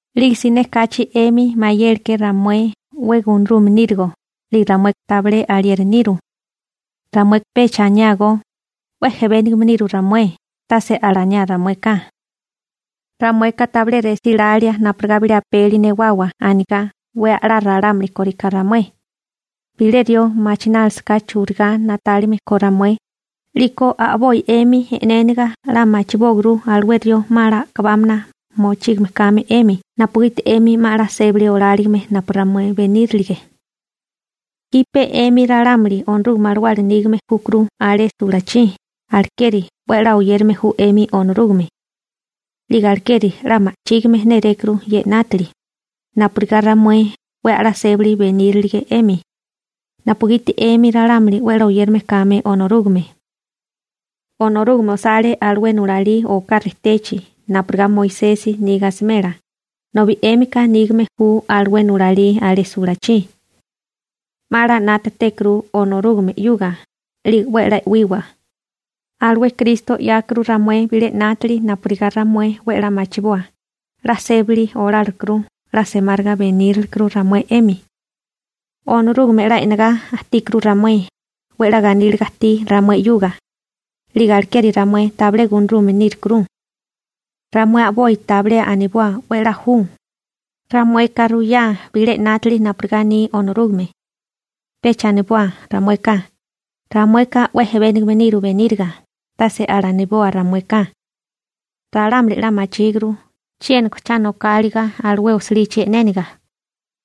'Lige siné kachi 'emi mayéleké ramué 'we gunarume nírigo, 'lige ramueka tabilé alieri niru. Ramueka pecha aniágó: «'We jebénigame niru ramué», tase alaniá ramueka. Ramueka tabilé resílalía napurigá bilé apeli newawa anigá 'we 'la ralámuli kóriká ramué. Bilé rió machinálisaká churigá na'tálime ko ramué, 'liko a'boi 'emi e'néniga 'la machibóaguru alué rió 'ma 'la a'kabámana mochígame kame 'emi napugiti 'emi 'ma 'la sébali oláligime napu ramué benírilige. Jipe 'emi ralámuli Onorúgame Alawala nígame júkuru alé sulachí, alekeri 'we a'lá oyérame ju 'emi Onorúgame. 'Lige alekeri 'la ma'chígime nérékuru ye 'nátili, napurigá ramué 'we a'lá sébali benírilige 'emi, napugiti 'emi ralámuli 'we a'lá oyérame kame Onorúgame. Onorúgame osale alué nulalí oká rejtechi napurigá Moisesi niga asimela, nobi 'émika nígame ju alué nulalí alé sulachí. 'Ma 'la na'tátékuru Onorúgame 'yuga 'lige 'we a'lá e'wiwa. Alué Kristo 'yákuru ramué bilé 'nátili napurigá ramué 'we a'lá machiboa 'la sébali olálikuru 'la semáriga benírilekuru ramué 'emi. Onorúgame 'la e'negá ajtíkuru ramué, 'we 'la ganíliga ajtí ramué 'yuga. 'Lige alekeri ramué tabilé gunarume nírukuru. Ramué a'boi tabilé aniboa 'we a'lá ju. Ramueka ruyá bilé 'nátili napurigá aní Onorúgame. Pecha aniboa ramueka: «Ramueka 'we ejebénigame niru beníriga», tase alaniboa ramueka. Ralámuli 'la machíguru chiéniko cha nokáliga alué osilichi e'néniga,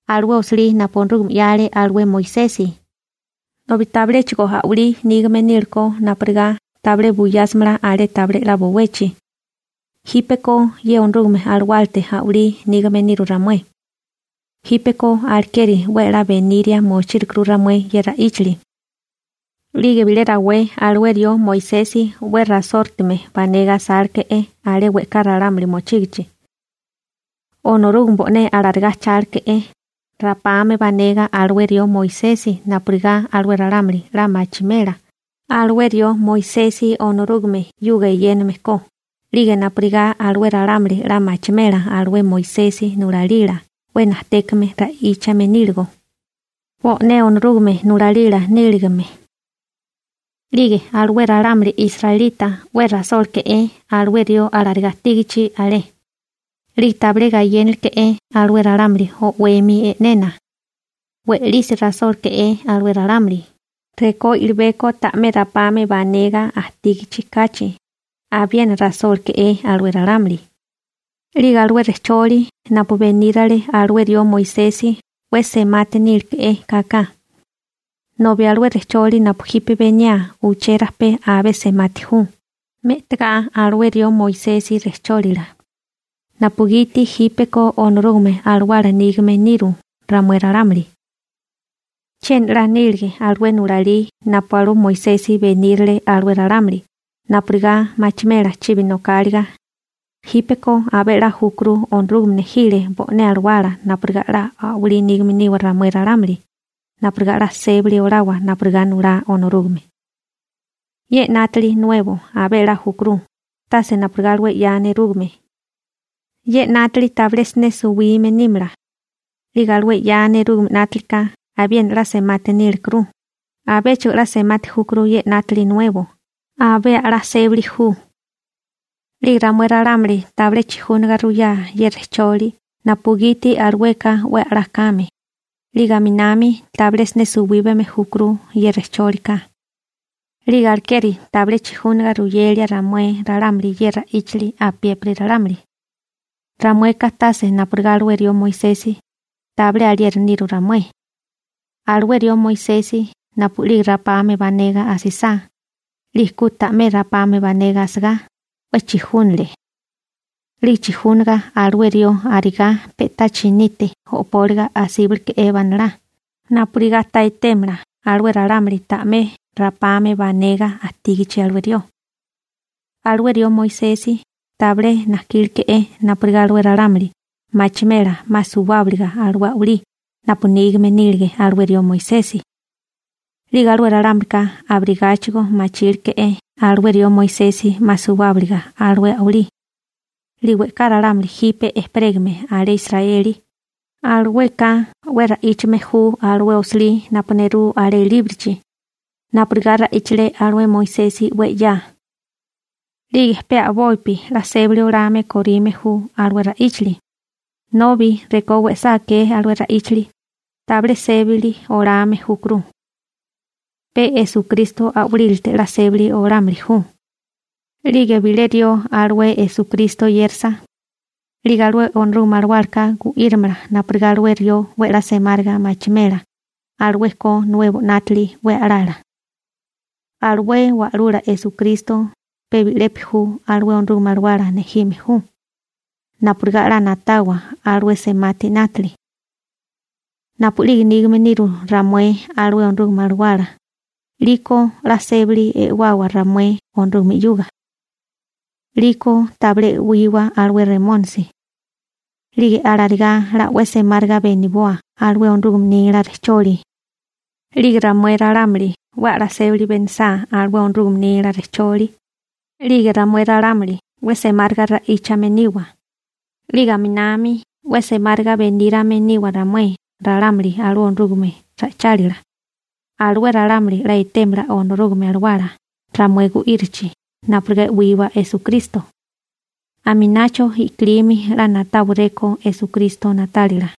alué osilí napu Onorúgame 'yale alué Moisesi, nobi tabiléchigo a'walí nígame nílekó napurigá tabilé buyásimala alé tabilé 'la bowechi. Jípeko ye Onorúgame Alawálate a'walí nígame niru ramué. Jípeko alekeri 'we 'la beniria mochírukuru ramué ye ra'íchali. 'Lige bilé rawé alué rió Moisesi 'we rasórutume banega asáleke'é alé we'ká ralámuli mochígichi. Onorúgame bo'né alarigá ajcháleke'é rapame banega alué rió Moisesi napurigá alué ralámuli 'la machimela alué rió Moisesi Onorúgame 'yuga eyéname ko 'lige napurigá alué ralámuli 'la machimela alué Moisesi nulalila 'we najtékame ra'íchame níligo, bo'né Onorúgame nulalila níligime. 'Lige alué ralámuli israelita 'we rasóleke'é alué rió alarigá ajtígichi alé. 'Lige tabilé gayénaleke'é alué ralámuli o'wemi e'nena. We'lisi rasóleke'é alué ralámuli, rekó we'libeko ta'mé rapame banega ajtígichi kachi abiena rasóleke'é alué ralámuli. 'Lige alué rejcholi napu benírale alué rió Moisesi 'we semati níleke'é kaka, nobi alué rejcholi napu jipe beniaa uché rajpé abé semati ju, me'tagá alué rió Moisesi rejchólila, napugiti jípeko Onorúgame Alawala nígame niru ramué ralámuli. Chiena 'la nílige alué nulalí napu alué Moisesi benírile alué ralámuli napurigá machimela chibi nokáliga, jípeko abé a'lá júkuru Onorúgame nejile bo'né Alawala napurigá 'la a'walí nígame niwa ramué ralámuli napurigá 'la sébali olawa napurigá nulá Onorúgame. Ye 'nátili nuebo abé a'lá júkuru, tase napurigá alué 'ya nerúgame. Ye 'nátili tabilé siné suwime nímala. 'Lige alué 'ya nerúgame 'nátilika abiena 'la semati nílekuru. Abéchigo 'la semati júkuru ye 'nátili nuebo, abé a'lá sébali ju. 'Lige ramué ralámuli tabilé chijúnaga ruyá ye rejcholi napugiti alueka 'we a'lá kame, 'lige aminami tabilé siné suwíbame júkuru ye rejchólika. 'Lige alekeri tabilé chijúnaga ruyelia ramué ralámuli ye ra'íchali apiépiri ralámuli. Ramueka tase napurigá alué rió Moisesi, tabilé alieri niru ramué. Alué rió Moisesi napu'lige rapame banega asisá, 'lige ku ta'mé rapame banega asagá, 'we chijúnale. 'Lige chijúnaga alué rió arigá pe'tá chinite o'póliga asíbaleke'é banalá napurigá ta etémala alué ralámuli ta'mé rapame banega ajtígichi alué rió. Alué rió Moisesi tabilé najkíleke'é napurigá alué ralámuli machimela 'ma suwábiliga alué a'walí napu nígame nílige alué rió Moisesi. 'Lige alué ralámulika abirigáchigo machíleké alué rió Moisesi 'ma suwábiliga alué a'walí. 'Lige we'ká ralámuli jipe ejperégame alé Israeli, alueka 'we ra'íchame ju alué osilí napu nerú alé líbrochi, napurigá ra'íchale alué Moisesi 'we 'ya. 'Lige pe a'bopi 'la sébali olame korime ju alué ra'íchali, nobi rekó we'sá akee alué ra'íchali, tabilé sébali olame júkuru. Pe Esukristo a'walílate 'la sébali olámili ju. 'Lige bilé rió alué Esukristo oyérasa, 'lige alué Onorúgame Alawálaka gu'írimala napurigá alué rió 'we 'la semáriga machimela alué ko nuebo 'nátili 'we a'lala. Alué Wa'lula Esukristo pe bi'lepi ju alué Onorúgame Alawala nejime ju, napurigá 'la na'tawa alué semati 'nátili. Napu'lige nígame niru ramué alué Onorúgame Alawala, 'liko 'la sébali e'wawa ramué Onorúgame 'yuga. 'Liko tabilé e'wiwa alué Remónisi. 'Lige alarigá 'la 'we semáriga beniboa alué Onorúgame nila rejcholi. 'Lige ramué ralámuli 'we a'lá sébali benisá alué Onorúgame nila rejcholi, 'lige ramué ralámuli 'we semáriga ra'íchame niwa. 'Lige aminami 'we semáriga benírame niwa ramué ralámuli alué Onorúgame ra'ichálila. Alué ralámuli 'la etémala Onorúgame Alawala ramué gu'írichi napurigá e'wiwa Esukristo. Aminacho i'kilimi 'la na'táwaréko Esukristo na'tálila.